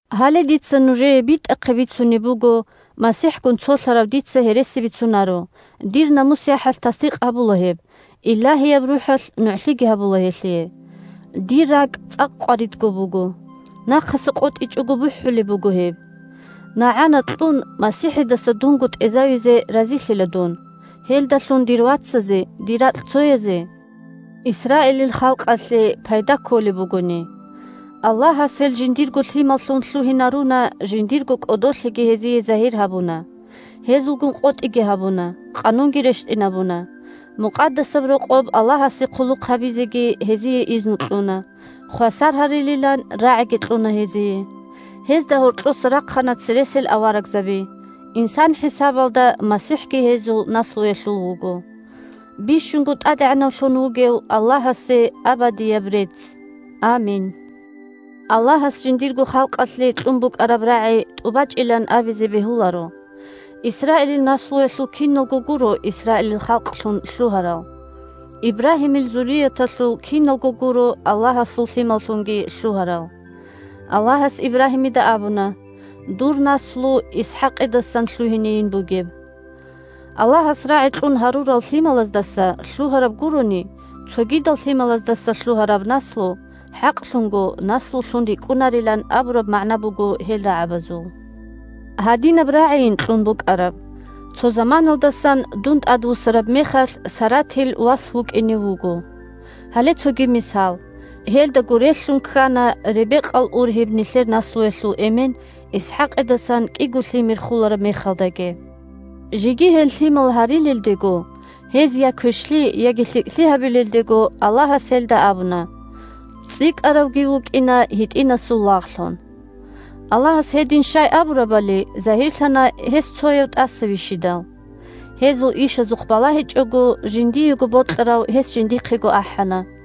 Гьале дица нужее битӀахъе бицунеб буго (МасихӀгун цолъарав дица гьереси бицунаро, – дир намус-яхӀалъ тасдикъ гьабула гьеб, Илагьияб РухӀалъ нугӀлъиги гьабула гьелъие): дир ракӀ цӀакъ къваридго буго, нахъаса къотӀичӀого бухӀулеб буго гьеб. НагӀана кьун, МасихӀидаса дунго тӀезавизе разилъила дун, гьелдалъун дир вацазе, дир ракьцоязе, Исраилил халкъалъе пайда кколеб бугони. Аллагьас гьел жиндирго лъималлъун лъугьинаруна, жиндирго кӀодолъиги гьезие загьир гьабуна, гьезулгун къотӀиги гьабуна, Къанунги рещтӀинабуна, Мукъадасаб Рокъоб Аллагьасе хъулухъ гьабизеги гьезие изну кьуна, хвасар гьарилилан рагӀиги кьуна гьезие. Гьезда гьоркьоса рахъана цересел аварагзаби, инсан хӀисабалда МасихӀги гьезул наслуялъул вуго. Бищунго тӀадегӀанавлъун вугев Аллагьасе абадияб рецц! Амин. Аллагьас жиндирго халкъалъе кьун букӀараб рагӀи тӀубачӀилан абизе бегьуларо. Исраилил наслуялъул киналго гуро Исраилил халкълъун лъугьарал. Ибрагьимил зурияталъул киналго гуро Аллагьасул лъималлъунги лъугьарал. Аллагьас Ибрагьимида абуна: «Дур наслу ИсхӀакъидасан лъугьинейин бугеб». Аллагьас рагӀи кьун гьарурал лъималаздаса лъугьараб гурони, цогидал лъималаздаса лъугьараб наслу хӀакълъунго наслулъун рикӀкӀунарилан абураб магӀна буго гьел рагӀабазул. Гьадинаб рагӀийин кьун букӀараб: «Цо заманалдасан дун тӀадвуссараб мехалъ, Саратил вас вукӀине вуго». Гьале цоги мисал. Гьелдаго релълъун ккана Ребекъал ургьиб нилъер наслуялъул эмен ИсхӀакъидасан кӀиго лъимер хулараб мехалдаги. Жеги гьел лъимал гьарилелдего, гьез я квешлъи, яги лъикӀлъи гьабилелдего, Аллагьас гьелда абуна: «ЦӀикӀкӀаравги вукӀина гьитӀинасул лагълъун». Аллагьас гьедин щай абурабали загьирлъана гьес цояв тӀаса вищидал. Гьезул ишазухъ балагьичӀого, жиндиего бокьарав гьес жиндихъего ахӀана.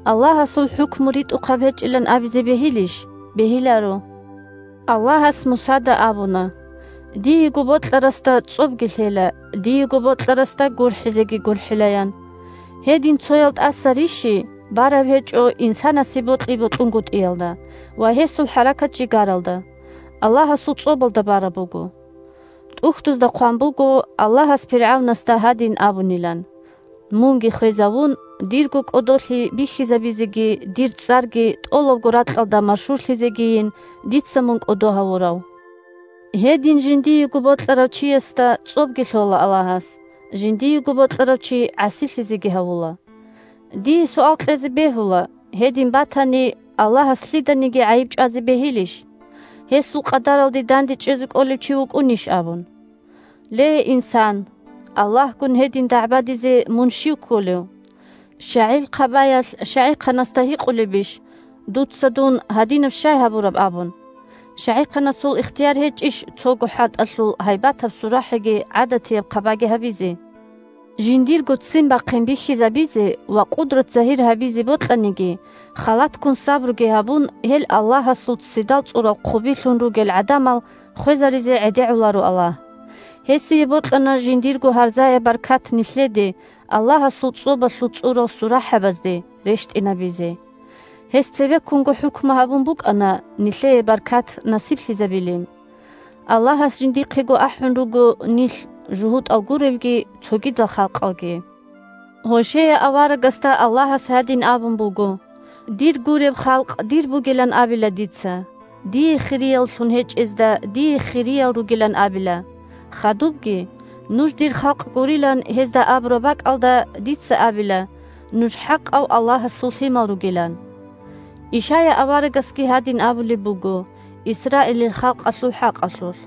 Аллагьасул хӀукму ритӀухъаб гьечӀилан абизе бегьилищ? Бегьиларо! Аллагьас Мусада абуна: «Диего бокьарасда цӀобги лъела, диего бокьарасда гурхӀизеги гурхӀила», – ян. Гьедин цоял тӀаса рищи бараб гьечӀо инсанасе бокьи-бокьунгутӀиялда ва гьесул хӀаракат-жигаралда, Аллагьасул цӀобалда бараб буго. ТӀухьдузда хъван буго Аллагьас пиргӀавнасда гьадин абунилан: «Мунги хвезавун, дирго кӀодолъи бихьизабизеги дир цӀарги тӀолабго ракьалда машгьурлъизегийин дица мун кӀодо гьавурав». Гьедин жиндиего бокьарав чиясда цӀобги лъола Аллагьас, жиндиего бокьарав чи гӀасилъизеги гьавула. Дие суал кьезе бегьула: «Гьедин батани, Аллагьас лъиданиги гӀайиб чӀвазе бегьилищ? Гьесул къадаралде дандечӀезе кӀолев чи вукӀунищ?» – абун. Ле инсан, Аллагьгун гьедин дагӀбадизе мун щив кколев? ЩагӀил хъабаялъ щагӀихъанасда гьикъулебищ: «Дуца дун гьадинаб щай гьабураб?» – абун. ЩагӀихъанасул ихтияр гьечӀищ цого хӀатӀалъул гьайбатаб сурахӀиги гӀадатияб хъабаги гьабизе? Жиндирго ццин бахъин бихьизабизе ва къудрат загьир гьабизе бокьаниги, халатккун сабруги гьабун, гьел «Аллагьасул ццидал цӀурал хъубилъун» ругел гӀадамал хвезаризе гӀедегӀуларо Аллагь. Гьесие бокьана жиндирго гьарзаяб баркат нилъеде – «Аллагьасул цӀобалъул цӀурал сурахӀабазде» – рещтӀинабизе. Гьес цебеккунго хӀукму гьабун букӀана нилъее баркат насиблъизабилин. Аллагьас жиндихъего ахӀун руго нилъ – жугьутӀал гурелги, цогидал халкъалги. Гьошея аварагасда Аллагьас гьадин абун буго: «Дир гуреб халкъ дир бугилан абила дица, дие хирияллъун гьечӀезда дие хириял ругилан абила». Хадубги: «Нуж дир халкъ гурилан гьезда абураб бакӀалда дица абила нуж хӀакъав Аллагьасул лъимал ругилан». Ишая аварагасги гьадин абулеб буго Исраилил халкъалъул хӀакъалъулъ: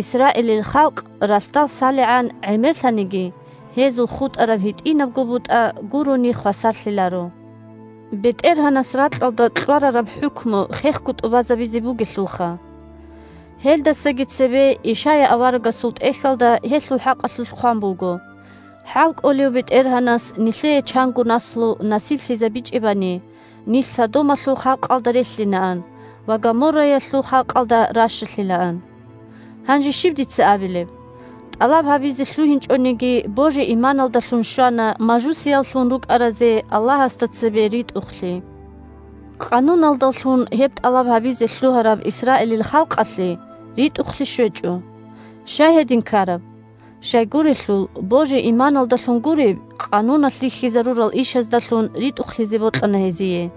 «Исраилил халкъ ралъдал салигӀан гӀемерлъаниги, гьезул хутӀараб гьитӀинабго бутӀа гурони хвасарлъиларо. БетӀергьанас ракьалда кьварараб хӀукму хехго тӀубазабизе бугелъулха». Гьелдасаги цебе Ишая аварагасул тӀехьалда гьелъул хӀакъалъулъ хъван буго: «ХӀалкӀолев БетӀергьанас нилъее чанго наслу насиблъизабичӀебани, нилъ Содомалъул халкъалда релълъинаан ва Гоморраялъул халкъалда ращалъилаан». Гьанже щиб дица абилеб? ТӀалаб гьабизе лъугьинчӀониги, божи-иманалдалъун щвана мажусияллъун рукӀаразе Аллагьасда цебе ритӀухълъи. Къануналдалъун гьеб тӀалаб гьабизе лъугьараб Исраилил халкъалъе ритӀухълъи щвечӀо. Щай гьедин ккараб? Щайгурелъул, божи-иманалдалъун гуреб, Къануналъ рихьизарурал ишаздалъун ритӀухълъизе бокьана гьезие.